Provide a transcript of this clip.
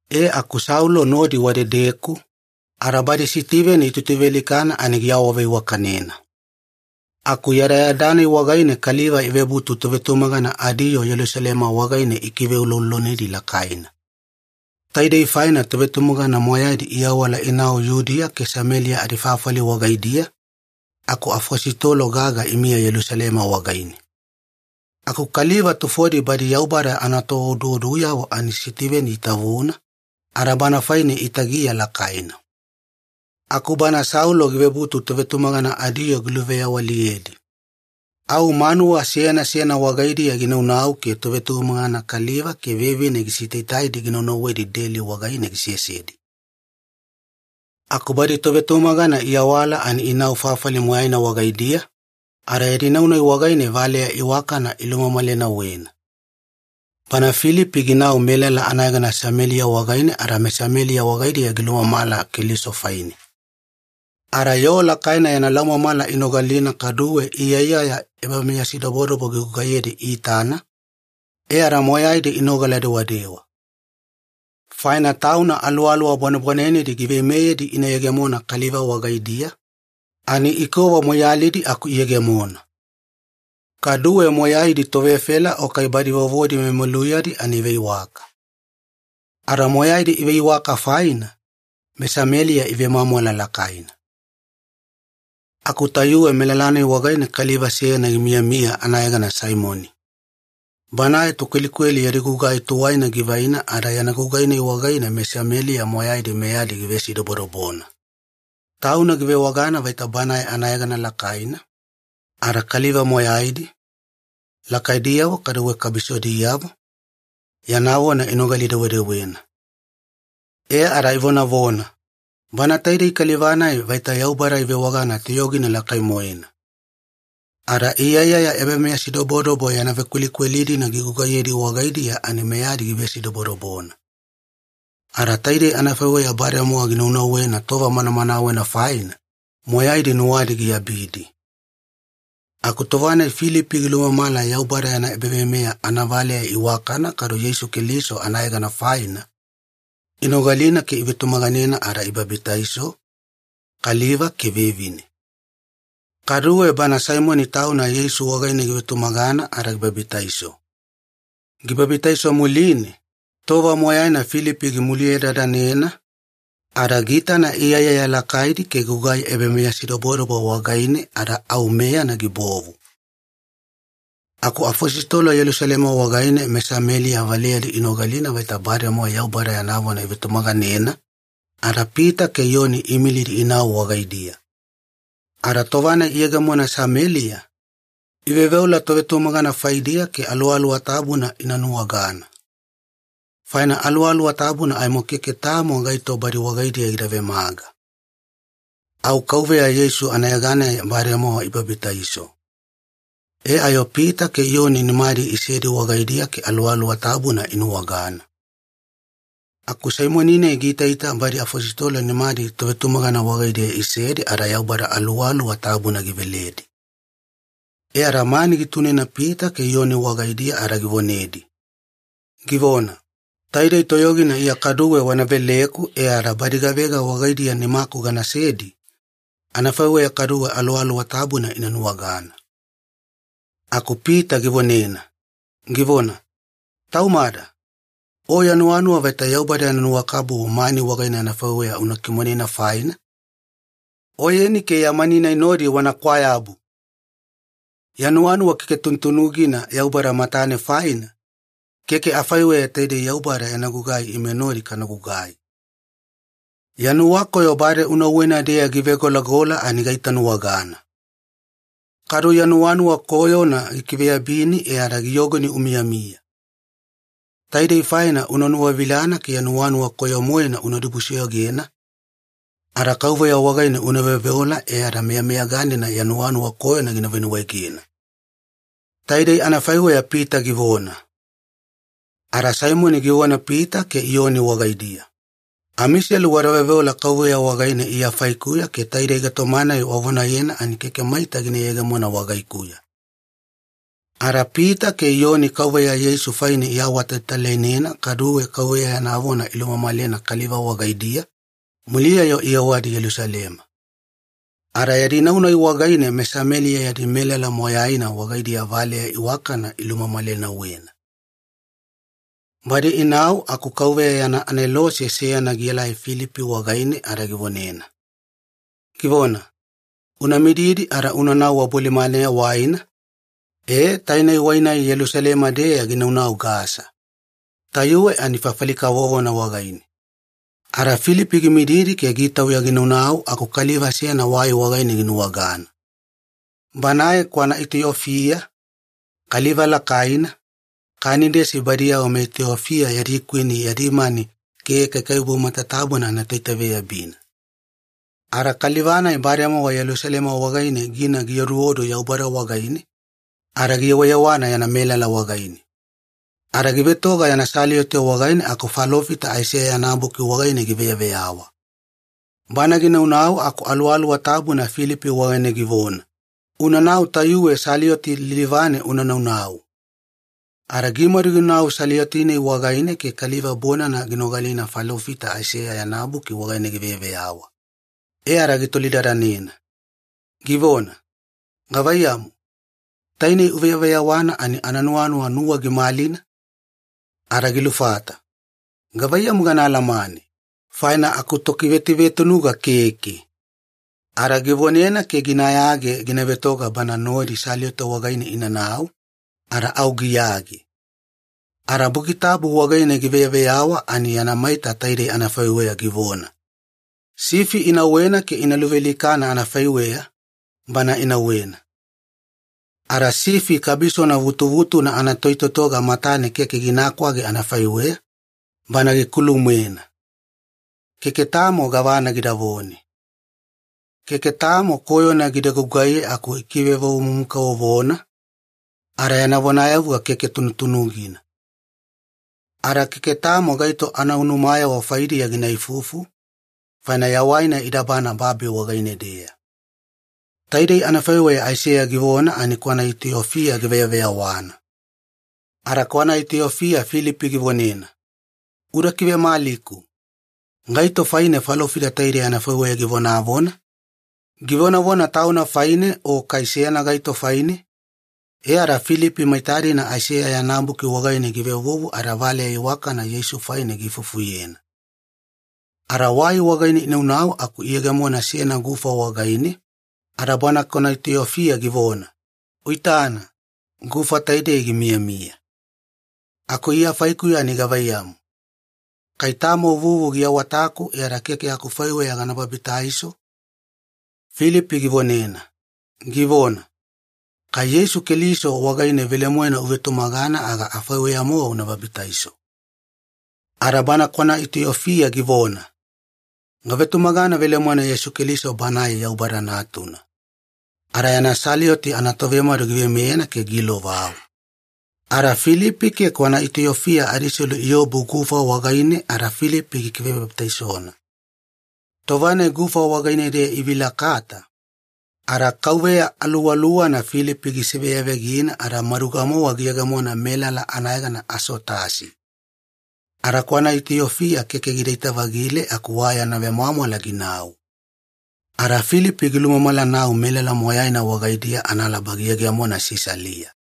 E aku Saulo nodi wadedeku, ada badi Sitiveni itutuvealikana ani giawaveiwakanena. Aku yadayada-nai wagaine kaliva ivebutu tovetumagana adiyoo Yelusalema wagaine ikiveuloulolonidi lakaina. Taidei faina tovetumagana moyaidi iawala inau Yudiya ke Sameliya adifafali wagaidiya, aku afositolo gaga imiya Yelusalema wagaine. Aku kaliva tufodi badi Yaubada anatooduoduyavo ani Sitiveni itavuna, ada bana faine itagiya lakaina. Aku bana Saulo givebutu tovetumagana adiyoo giluveyawaliyedi. Au manuwa seyana seyana wagaidiya ginaunau ke tovetumagana kaliva ke vevine gisitaitaidi ginaunauwedi deli wagaine gisesedi. Aku badi tovetumagana iawala ani inau fafali moyaina wagaidiya, ada yadi nau-nai wagaine valeya iwakana ilumamalenauwena. Bana Filipi ginau melala anayegana Sameliya wagaine ada meSameliya wagaidiya gilumamala Keliso faine. Ada yoo lakaina yana laumamala inogalina kaduwe iyaiyaya ebameyasidobodobo gigugaiyedi iitana, e ada moyaidi inogala-dewadewa. Faina tauna aluwaluwa bwanebwanenedi giveimeyedi ina yegemona kaliva wagaidiya, ani ikova moiyalidi aku iyegemona. Kaduwe moyaidi tovefela o kai badi vovodi memeluyadi ani iveiwaka. Ada moyaidi iveiwaka faina, meSameliya ivemwamwala lakaina. Aku tayuwe melala-nai wagaine kaliva seyana gimiyamiya anayegana Saimoni. Banae tokwelikweli yadi gugai tuwaina givaina ada yana gugai-nai wagaine meSameliya moyaidi meyadi givesidobodobona. Tauna givewagana vaita banae anayegana lakaina, ada kaliva moyaidi, lakaidiyavo kaduwe kabisodiyavo, yana vona inogali-dewedewena. E ada ivonavona, “Bana taidei kaliva-nai vaita Yaubada ivewagana Toyogina Lakai-moena.” Ada iyaiyaya ebameyasidobodobo yana vekwelikweli-dina gigugaiyedi wagaidiya ani meyadi givesidobodobona. Ada taidei anafaiweya bademowa ginunauwena tova manamanawena faina, moyaidi nuwadi giabidi. Aku tova-nai Filipi gilumamala Yaubada yana ebaveimeya anavaleya iwakana kadu Yeisu Keliso anayegana faina, inogalina ke ivetumaganena ada ibabitaiso, kaliva ke vevine. Kaduwe bana Saimoni tauna Yeisu wagaine givetumagana ada gibabitaiso. Gibabitaiso muline, tova moyaina Filipi gimuliyedadanena, ada giitana iyaiyaya lakaidi ke gugai ebameyasidobodobo wagaine ada au meyana gibovu. Aku afositolo Yelusalema wagaine meSameliya valeyadi inogalina vaita bademowa Yaubada yana vona ivetumaganena, ada Pita ke Iyoni iimilidi inau wagaidiya. Ada tova-nai iyegemona Sameliya, iveoveola tovetumagana faidiya ke Aluwaluwa Tabuna ina nuwagana. Faina Aluwaluwa Tabuna aimo keke tamo gaito badi wagaidiya gida vemaga. Au Kauveya Yeisu anayeganeya bademowa ibabitaiso. E ayo Pita ke Iyoni nimadi isedi wagaidiya ke Aluwaluwa Tabuna inuwagana. Aku Saimoni-nai giitaita badi afositolo nimadi tovetumagana wagaidiya isedi ada Yaubada Aluwaluwa Tabuna giveledi. E ada mani gitunena Pita ke Iyoni wagaidiya ada givonedi, givona, “Taidei toyogina Iya kaduwe wana veleku e ada badi gavega wagaidiya nimaku ganasedi, anafaiweya kaduwe Aluwaluwa Tabuna ina nuwagana.” Aku Pita givonena, givona, “Taumada! O ya nuwanuwa vaita Yaubada yana nuwakabubu mani wagaine afaiweya una kimonena faina, oyeni ke ya mani-nai nodi wana kwayabu! Ya nuwanuwa keke tunutunugina Yaubada matane faina, keke afaiweya taidei Yaubada yana gugai ime nodi kana gugai. Ya nuwakoyo bade unauwena-deya givegolagola ani gaitanuwagana. Kadu ya nuwanuwa koyona gikiveyabini e ada giyogoni umiyamiya. Taidei faina una nuwavilana ke ya nuwanuwa koyo-moena una dibusoyogena, ada Kauveya wagaine una veoveola e ada meyameyaganina ya nuwanuwa koyona gina venuwaegena.” Taidei anafaiweya Pita givona. Ada Saimoni givona Pita ke Iyoni wagaidiya, “Amiselu wada veoveola Kauveya wagaine Iya faikuya ke taidei gaitoma-nai wavonayena ani keke maita gina yegemona wagaikuya.” Ada Pita ke Iyoni Kauveya Yeisu faine iawatalatalainena kaduwe Kauveya yana vona ilumamalena kaliva wagaidiya, muliya-yo iyewadi Yelusalema. Ada yadi nau-nai wagaine meSameliya yadi melala moyaina wagaidiya valeya iwakana ilumamalenauwena. Badi inau aku Kauveya yana anelose seyana gielai Filipi wagaine ada givonena, givona, “Una mididi ada unanau wabolimaneya waina, e taine wai-nai Yelusalema-deya ginaunau Gasa. Tayuwe ani fafali kavovona wagaine.” Ada Filipi gimididi ke gitauya ginaunau aku kaliva seyana wai wagaine ginuwagana. Banae kwana Itiofia, kaliva lakaina, Kanidesi badiyavo meItiofia yadi kwini yadi mani ke kaikaiwabu matatabuna anatoitaveyabina. Ada kaliva-nai bademowa Yelusalema wagaine gina gioduodu Yaubada wagaine, ada giyewayewana yana melala wagaine. Ada givetoga yana salioti wagaine aku falofita Aiseya yana buki wagaine giveyaveyawa. Bana ginaunau aku Aluwaluwa Tabuna Filipi wagaine givona, “Unanau tayuwe salioti lilivane una naunau.” Ada gimadu ginau salioti-nai wagaine ke kaliva bonana ginogalina falofita Aiseya yana buki wagaine giveyaveyawa. E ada gitolidadanena, givona, “Gavaiyamu, taine uveyaveyawana ani ananuwanuwa nuwa gimalina?” Ada gilufata, “Gavaiyamu gana alamane, faina akutokivetuvetunuga keke.” Ada givonena ke ginayage gina vetoga bana nodi salioti wagaine inanau, ada au giyage. Ada Buki Tabu wagaine giveyaveyawa ani yana maita taidei anafaiweya givona, “Sifi inauwena ke ina luvealikana anafaiweya, Bana inauwena. Ada sifi kabisona vutuvutuna anatoitotoga matane keke gina kwage anafaiweya, Bana gikulu-moena. Keke tamo gavana gidavone. Keke tamo koyona gida gugaiye aku ikivevovomumu-kavovona, ada yana vonayavuga keke tunutunugina. Ada keke tamo gaito anaunumayavo faidiya gina ifuifufu, faina yawaina idabana babi wagaine-deya.” Taidei anafaiweya Aiseya givona ani kwana Itiofia giveyaveyawana. Ada kwana Itiofia Filipi givonena, “Uda kivemaliku. Gaito faine falofita taidei anafaiweya givonavona? Givonavona tauna faine o kai seyana gaito faine?” E ada Filipi maita-dina Aiseya yana buki wagaine givevuvu, ada valeya iwakana Yeisu faine giifufuyena. Ada wai wagaine inaunau aku iyegemona seyana gufa wagaine, ada bana kwana Itiofia givona, “Uitana, gufa taidei gimiyamiya. Aku Iya faikuya ani gavaiyamu, kai tamo vuvu giawataku e ada keke akufaiweya gana babitaiso?” Filipi givonena, givona, “Kai Yeisu Keliso wagaine velemoena uvetumagana aga afaiweya-mowa una babitaiso.” Ada bana kwana Itiofia givona, “Gavetumagana velemoena Yeisu Keliso Banae Yaubada Natuna.” Ada yana salioti anatovemadu giveimeyena ke giilovau. Ada Filipi ke kwana Itiofia adiselu iobu gufa wagaine ada Filipi gikivebabitaisona. Tova-nai gufa wagaine-deya ivilakata, ada Kauveya Aluwaluwana Filipi gisiveyavegina ada maduga-mowa giyegemona melala anayegana Asotasi. Ada kwana Itiofia keke gidaita-vagile aku wa yana vemwamwala ginau. Ada Filipi gilumamalanau melala moyaina wagaidiya analaba giyegemona Sisalia.